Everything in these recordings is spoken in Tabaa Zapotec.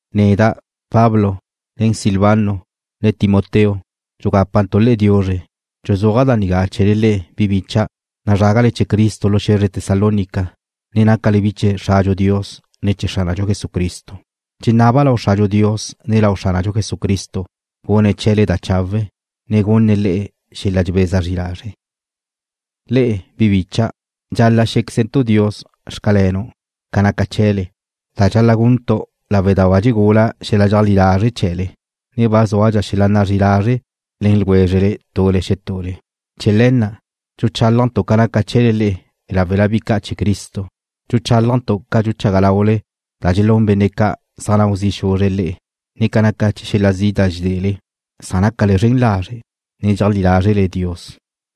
Neda', Pablo, nen Silvano, ne Timoteo, dxugápantu' le'e diuzre. Dxuzúaja' da nigá chee̱le le'e, bi bícha'dau', nazrágale chee̱ Cristo lu xe̱zre Tesalónica, ne nácale bi chee̱ Xradxu Dios, ne chee̱ Xránadxu Jesucristo. Dxenaba' lau Xradxu Dios, ne lau Xránadxu Jesucristo gune̱' chee̱le da chawe', ne gunne̱' le'e xel-la dxebeza zri lazre'. Le'e, bi bícha'dau', dxal-la' xé̱quezentu' Dios: Xcalenu' ca naca chee̱le, da dxal-la' guntu' lawe' da ba dxegula xel-la dxeajlí lazre' chee̱le, ne ba zúadxa xel-la nazrí'i lazre' le̱n ljwézrele tule xetule. Chee̱ le̱ na' dxuchálajntu' ca naca chee̱le le'e láwela bi ca' chee̱ Cristo. Dxuchálajntu' ca dxuchaga laule da dxelún benne' ca' zaj nau zi' xuzre̱' le'e, ne ca naca xel-la zi' da dxedele, san nácale zren lazre', ne dxeajlí lázrele Dios.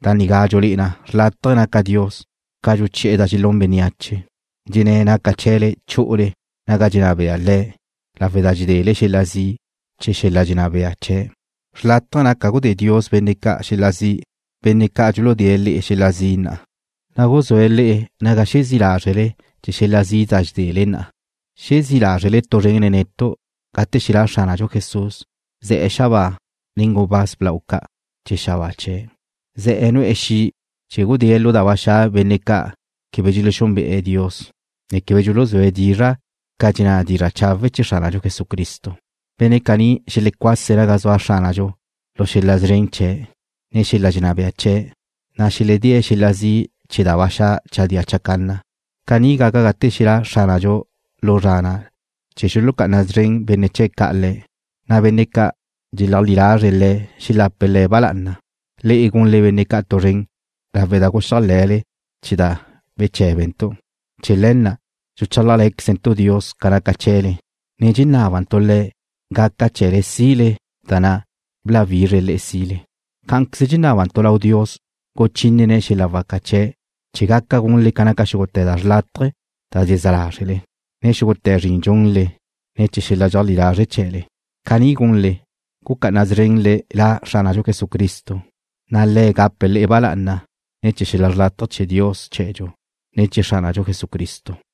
Da nigá dxulé'e na xlátaje̱ naca Dios ca dxuchi'e̱ da dxelún bénneache, dxenné̱' naca chee̱le chu'ule naga dxenná bea Le̱' lawe' da dxedele xel-la zi' chee̱ la' xel-la dxenná bea chee̱'. Xlátaje̱ naca gudé Dios benne' ca' xel-la zi', benne' ca' dxuludée̱' le'e xel-la zi' na'a, na' guzúe̱' le'e naga xezí' lázrele chee̱ xel-la zi' da dxedele na'a. Xezí lázrele tu zren nen netu' gate xelá' Xránadxu Jesús, ze̱'e̱ xabáa nen gubáz blau ca' chee̱ xabáa chee̱'. Ze̱'e̱ nu'e̱ xi' chee̱ gudée̱' lu da ba xa' benne' ca' quebe dxelexúnbe'e̱ Dios, ne quebe dxuluzúe̱' dizra' ca dxenná dizra' chawe' chee̱ Xránadxu Jesucristo. Benne' caní xelecuase̱' naga zua Xránadxu lu xel-la szren chee̱', ne xel-la dxenná bea chee̱', na' xeledée̱' xel-la zi' chee̱ da ba xa' chadía chacanna. Caní gaca gate xelá' Xránadxu lu zra na' chee̱ xulucá'ana szren benne' chee̱' ca' Le̱', na' benne' ca' dxeajlí lazre̱' Le̱' xelape̱' Le̱' ba lá'ana. Le'e gunle benne' ca' tu zren lawe' da guxéajle̱le chee̱ da beché̱bentu'. Chee̱ le̱ na' tu dxuchálajle̱quezentu' Dios ca naca chee̱le, ne dxenábantu' Le̱' gaca chee̱le sile da na' bláwizre̱' le'e sile. Cá'anqueze dxenábantu' lau Dios guchínene̱' xel-la waca chee̱' chee̱ gaca gunle ca naca xúgute̱ da xrlátaje da dxezá lázrele, ne xúgute̱ zrin dxunle ne̱ chee̱ xel-la dxeajlí lazre' chee̱le. Caní gunle, gucá'ana szrenle La Xránadxu Jesucristo, na' Le̱' gape̱' le'e ba lá'ana ne̱ chee̱ xel-la xrlátaje chee̱ Dios chee̱dxu, ne chee̱ Xránadxu Jesucristo.